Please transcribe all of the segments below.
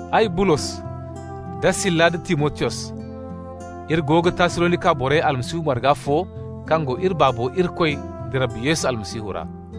Ay, Bulos, da Sila nda Timotiyos, iri go ga Tassalonika borey Almasihu marga fo kaŋ go iri Baabo Irikoy da Rabbi Yesu Almasihu ra.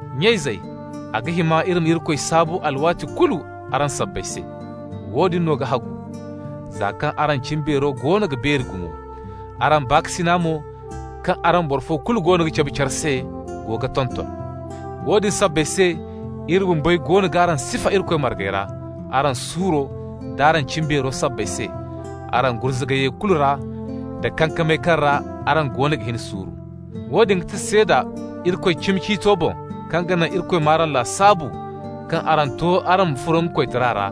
Nya-izey, a ga hima iri ma Irikoy saabu alwaati kulu araŋ sabbay se. Woodin no ga hagu, za kaŋ araŋ cimbeero goono ga beeri gumo. Araŋ baakasina mo kaŋ araŋ boro fo kulu goono ga cabe care se go ga tonton. Woodin sabbay se iri bumbey goono g'araŋ sifa Irikoy margey ra araŋ suuro d'araŋ cimbeero sabbay se, araŋ gurzugayey kulu ra da kankamey kaŋ ra araŋ goono ga hin suuru. Woodin ga ti seeda Irikoy cimi ciito boŋ, kaŋ ga naŋ Irikoy m'araŋ lasaabu kaŋ araŋ to araŋ ma furo nga koytara ra,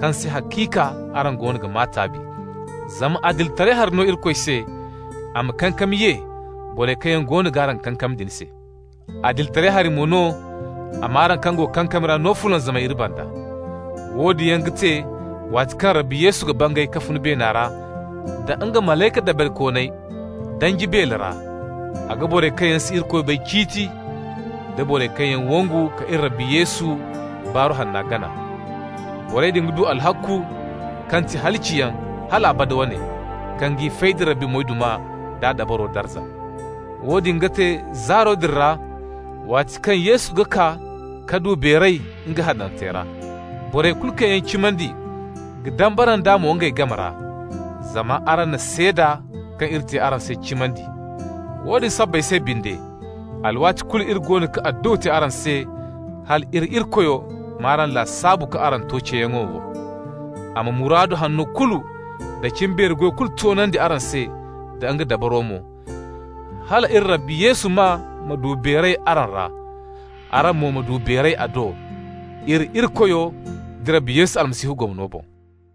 kaŋ se haciika araŋ goono ga maa taabi. Zama adilitaray hari no Irikoy se a ma kankami ye borey kaŋ yaŋ goono g'araŋ kankam din se. Adilitaray hari mo no a m'araŋ kaŋ go kankami ra no fulanzamay iri banda. Woodin yaŋ ga te waati kaŋ Rabbi Yesu ga bangay ka fun beena ra da nga malayka dabarikooney danji beele ra. A ga borey kaŋ yaŋ si Irikoy bay ciiti, da borey kaŋ yaŋ wangu ka iri Rabbi Yesu Baaru Hanna gana. Borey din ga du alhakku kaŋ ti halaciyaŋ, hal abada wane, kaŋ g'i fay da Rabbi moyduma d'a dabaro darza. Woodin ga te zaaro din ra waati kaŋ Yesu ga kaa ka du beeray nga hanantey ra. Borey kulu kaŋ yaŋ cimandi ga dambara nd'a mo ngey game ra. Zama araŋ na seeda kaŋ iri te araŋ se cimandi. Woodin sabbay se binde, alwaati kulu iri goono ga adduwa te araŋ se hal iri Irikoyo m'araŋ lasaabu kaŋ araŋ to ceeyaŋo wo. A ma muraadu hanno kulu da cimbeeri goy kulu toonandi araŋ se da nga dabaro mo, hal iri Rabbi Yesu maa ma du beeray araŋ ra, araŋ mo ma du beeray a do, iri Irikoyo da Rabbi Yesu Almasihu gomno boŋ.